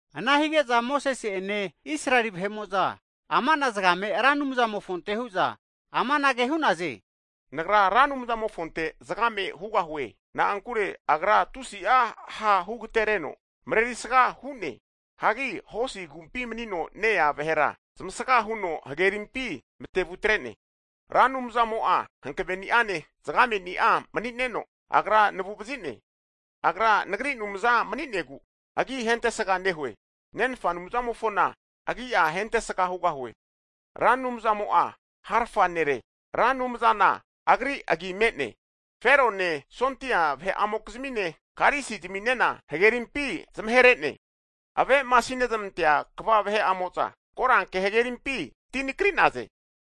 Ana hige'za Mosese'ene Israeli vahe'mo'za ama'na zagame Ra Anumzamofonte hu'za amanage hu'naze, Nagra Ra Anumzamofonte zagame hugahue, na'ankure Agra tusi'a ha' hu agatereneno, mareri sga hu'ne. Hagi hosi agumpi mani'za aza vahera zamasga huno hagerimpi matevutre'ne. Ra Anumzamo'a hankveni'ane zagame'ni'a mani'neno, Agra nagu'vazi'ne. Agra nagri Anumza mani'negu, agi hentesga nehue. Nenfa Anumzamofona agi'a hentesga hugahue. Ra Anumzamo'a harafa nere, Ra Anumzana agri agi me'ne. Ferone sondia vahe'amokizmine karisi ziminena, hagerimpi zmamahere'ne. Ave'masinezmantea kva vahe'amo'za koranke hagerimpi ti nakri'naze.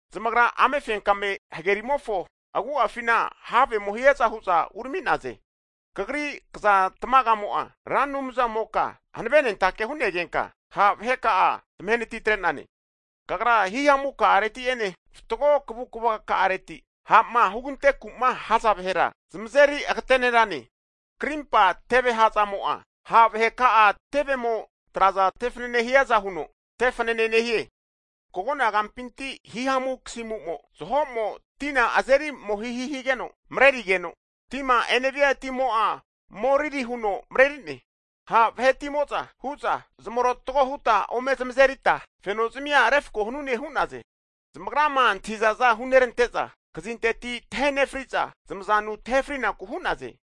Zamagra amefenkame hagerimofo agu'afina havemo hiaza hu'za urami'naze. Kagri kzan tmagamo'a Ra Anumzamoka hanavenentake hu'negenka, ha' vaheka'a zamahenati tre'nane. Kagra himamuka'areti'ene fatgo kavukavaka'areti ha'ma hugante ku'ma haza vahera zamazeri agatenerane. Krimpa teveha'zamo'a, ha' vahe ka'a tevemo traza tefanene hiaza huno tefanane nehie. Kagona gampinti himamu kasimu zaho'mo tina azerimohihi higeno marerigeno, tima enevia timo'a moriri huno mareri'ne. Ha' vahetimo'za hu'za, zmarotago huta ome zamazeri ta feno zazmia refako hanune hu'naze. Zamagrama antahizaza hunerante'za, kazinteti tahe nefriza zmazanu tahe frinaku hu'naze.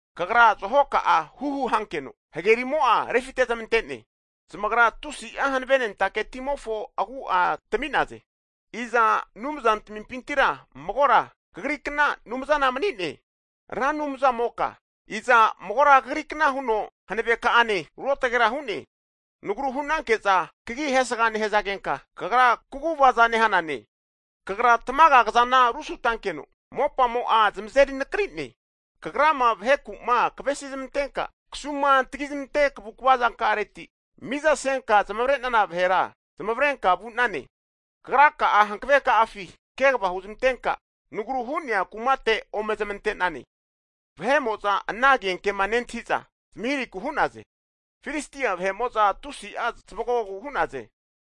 Kagra zaho ka'a huhu hankeno hagerimo'a refite'zamante'ne. Zamagra tusi'a hanavenentake timofo agu'a tami'naze. Iza anumza tamimpintira magora Kagrikna Anumzana mani'ne, Ra Anumzamoka? Iza magora Kagrikna huno Hankveka'ane Ruotgera hu'ne? Nagru hu'nanke'za Kagi hesga nehazagenka, Kagra kaguvaza nehane? Kagra tamaga kazana rusutankeno, mopamo'a zamazeri nakri'ne. Kagrama vaheku'ma kavesi zmantenka kasuma tagizmante kavukava zanka'areti, mizasenka zmavre'nana vahera zmavrenka vu'nane. Kagraka'a hankave ka'afi kegava huzmantenka nagru hu'nea kumate ome zamante'nane. Vahe'mo'za ana agenkema nentahi'za zmahirahiku hu'naze. Filistia vahe'mo'za tusi'a zamanogu hu'naze.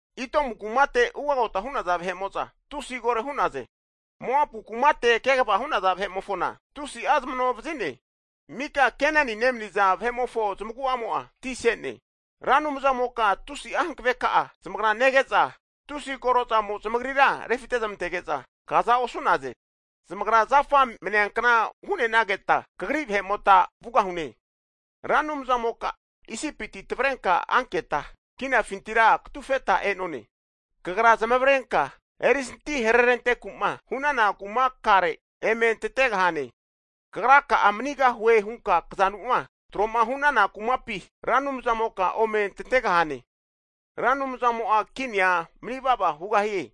Itomu kumate ugagota hu'naza vahe'mo'za, tusi koro hu'naze, Moapu kumate kegava hu'naza vahe'mofona, tusi zamano vazi'ne, mika Keneni nemaniza vahe'mofo zamagu'amo'a, ti se'ne. Ra Anumzamoka tusi'a hankave ka'a zamagra nege'za, tusi korozamo zmagrira refitezmantege'za, kaza osu'naze. Zamagra zafa mneankna hu'nenageta, Kagri vahe'mota vugahune. Ra Anumzamoka isipiti tavrenka anketa kinafintira katufeta e'none. Kagra zamavarenka erisanti harerantenku'ma hu'nana kumakare emetantegahane. Kagraka'a manigahue hunka kazanuma tro'ma hu'nana kumapi, Ra Anumzamoka ome tantegahane. Ra Anumzamo'a kinia manivava hugahie.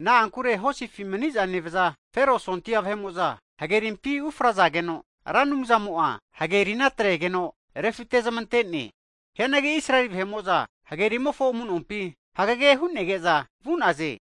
Na'ankure hosifi maniza nevaza Fero sondia vahe'mo'za hagerimpi ufrazageno, Ra Anumzamo'a hagerina atregeno refitezmante'ne. Hianagi Israel vahe'mo'za hagerimofo amu'nompi hagege hu'nege'za vu'naze.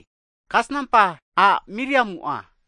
Kasnampa a' Miriamu,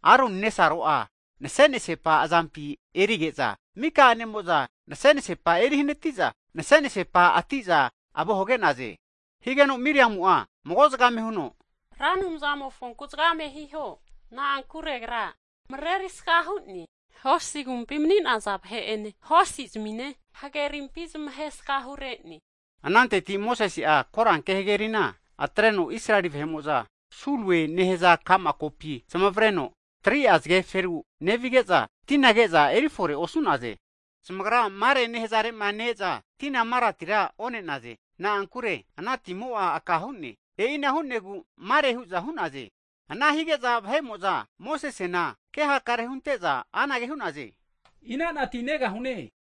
Aroni nesaro'a nase'nasepa azampi erige'za, mika a'nemo'za nase'nasepa erihanati'za nase'nasepa ati'za avo hage'naze. Higeno Miriamu'a mago zagame huno, Ra Anumzamofonku zagame hiho, na'ankure Agra marerisga hu'ne. Hosi agumpi mani'naza vahe'ene hosizmine hagerimpi zamasgahu re'ne. Ananteti Mosese'a koranke hagerina atreno Israeli vahe'mo'za Sulue nehaza ka'ma kopi zamavareno, 3'a zageferu nevige'za, tina ke'za erifore osu'naze. Zamagra Marae nehazare'ma ne-eza tina Maratira one'naze. Na'ankure ana timo'a aka hu'ne, E'ina hu'negu (aka hu'ne) Mare hu'za hu'naze, Ana hige'za vahe'mo'za Mosesena kehakare hunte'za anage hu'naze, ina'na ti negahune?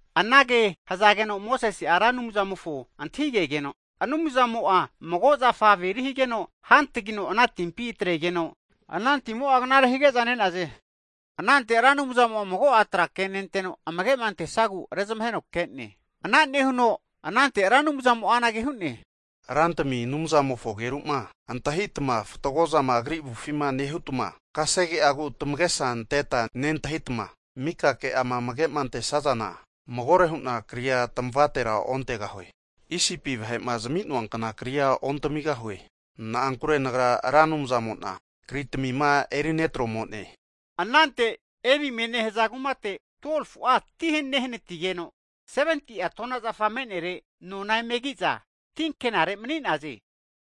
Anage hazageno Mosese'a Ra Anumzamofo antahigegeno, Anumzamo'a mago zafa averi higeno hantagino ana timpi atregeno, ana timo'a knare hige'za ne'naze. Anante Ra Anumzamo'a mago'a tra kenenteno amage'ma antesagu rezamaheno ke'ne. Ana nehuno anante Ra Anumzamo'a anage hu'ne, Rantimi Anumzamofo ageru'ma antahitama fatgo zama Agri avufima nehutma, kasege'agu'ma tamagesa anteta nentahitma, mika ke'ama amage'antesazana, magore hu'na kria tamavatera ontegahue, Isipi vahe'ma zmi'noankna kria ontamigahue. Na'ankure Nagra Ra Anumzamo'na, kritamima eri netromo'ne. Ananteti Elimie nehaza kumate 12fu'a ti nehanatigeno, 70'a tona'zafa me'nere nona emeki'za tinkenare mani'naze.